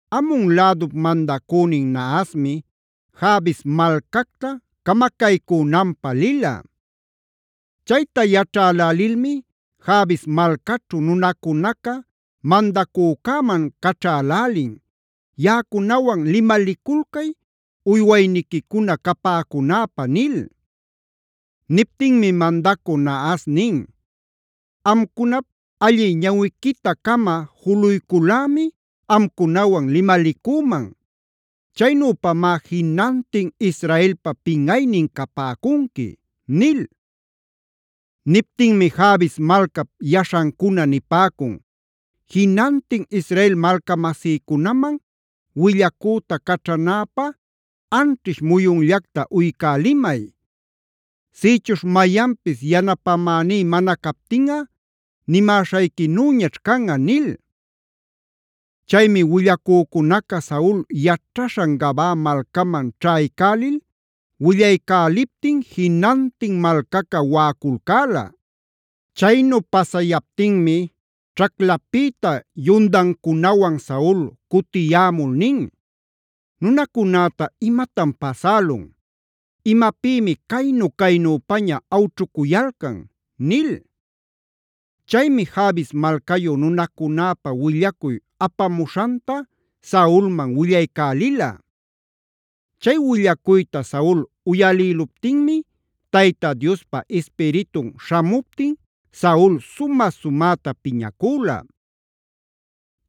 Amon lädup mandacünin Nahasmi Jabes malcacta camacaycunanpä lila. Chayta yaćhälälilmi Jabes malcaćhu nunacunaca mandacücäman caćhälälin: “Yaꞌacunawan limaliculcay uywayniquicuna capäcunäpä” nil. Niptinmi mandacü Nahas nin: “Amcunap allï ñawiquita-cama juluycul-lämi amcunawan limalicüman. Chaynüpamá jinantin Israelpa pinꞌaynin capäcunqui” nil. Niptinmi Jabes malcap yaśhancuna nipäcun: “Jinantin Israel malcamasïcunaman willacüta caćhanäpä anćhish muyunllacta uycälimay. Sïchuśh mayanpis yanapämäní mana captinꞌa nimäśhayquinüñaćh canꞌa” nil. Chaymi willacücunaca Saul yaćhaśhan Gabaa malcaman ćhaycälil willaycäliptin jinantin malcaca waꞌaculcäla. Chaynu pasayaptinmi ćhaclapïta yundancunawan Saul cutiyämul nin: “¿Nunacunäta imatan pasälun? ¿Imapïmi caynu-caynüpaña awćhucuyalcan?” nil. Chaymi Jabes malcayu nunacunäpä willacuy apamuśhanta Saulman willaycälila. Chay willacuyta Saul uyalïluptinmi Tayta Diospa Ispiritun śhämuptin Saul sumä-sumäta piñacüla.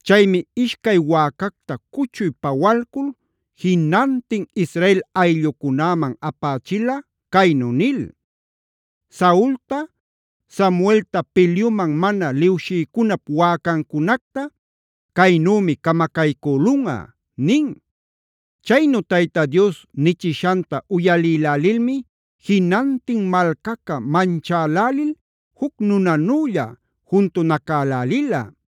Chaymi ishcay wäcacta cuchuy pawalcul jinantin Israel ayllucunäman apächila caynu nil: “Saulta, Samuelta pilyuman mana liwshïcunap wäcancunacta caynümi camacaycülunꞌa” nin. Chaynu Tayta Dios nichishanta uyalïlälilmi jinantin malcaca manchälälil juc nunanülla juntunacälälila.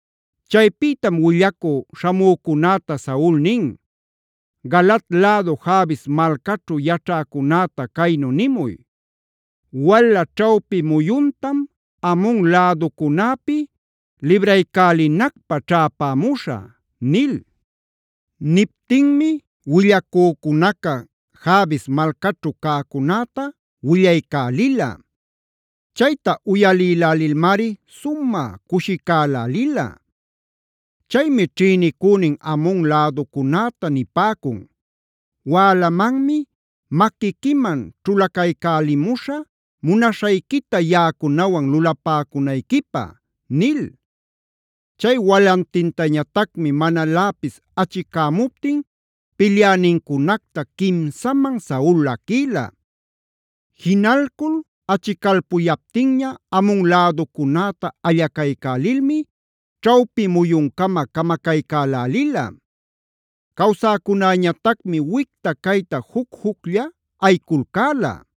Chaypïtam willacü śhamücunäta Saul nin: “Galaad lädu Jabes malcaćhu yaćhäcunäta caynu nimuy: ‘Wala ćhawpi muyuntam Amon läducunäpi libraycälinacpä ćhäpämuśhä’” nil. Niptinmi willacücunaca Jabes malcaćhu cäcunäta willaycälila. Chayta uyalilälilmari sumä cushicälälila. Chaymi ćhïnicünin Amon läducunäta nipäcun: “Wälamanmi maquiquiman ćhulacaycälimuśhä munaśhayquita yaꞌacunawan lulapäcunayquipä” nil. Chay walantintañatacmi manaläpis achicämuptin pilyänincunacta quimsaman Saul laquïla. Jinalcul achicalpuyaptinña Amon läducunäta allacaycälilmi ćhawpi muyuncama camacaycälälila. Cawsäcunäñatacmi wicta cayta juc-juclla ayiculcäla.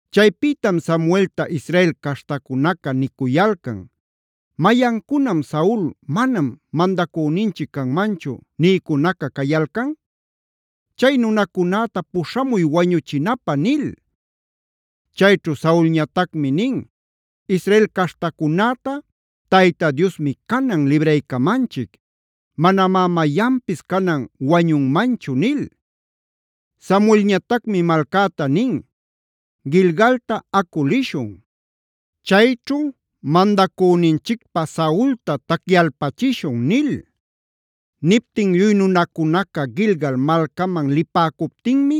Chaypïtam Samuelta Israel caśhtacunaca nicuyalcan: “¿Mayancunam ‘Saul manam mandacüninchic canmanchu’ nïcunaca cayalcan? Chay nunacunäta puśhamuy wañuchinapä” nil. Chaychu Saulñatacmi nin: “Israel caśhtacunäta Tayta Diosmi canan libraycamanchic. Manamá mayanpis canan wañunmanchu” nil. Samuelñatacmi malcäta nin: “Gilgalta acu lishun; chayćhu mandacüninchicpä Saulta tacyalpachishun” nil. Niptin lluy nunacunaca Gilgal malcaman lipäcuptinmi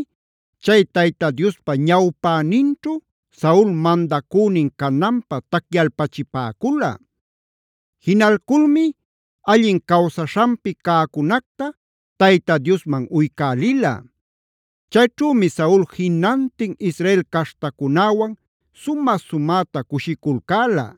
chay Tayta Diospa ñawpäninćhu Saul mandacünin cananpä tacyalpachipäcula. Jinalculmi allin cawsaśhanpi cäcunacta Tayta Diosman uycälila. Chayćhümi Saul jinantin Israel caśhtacunäwan sumä-sumäta cushiculcäla.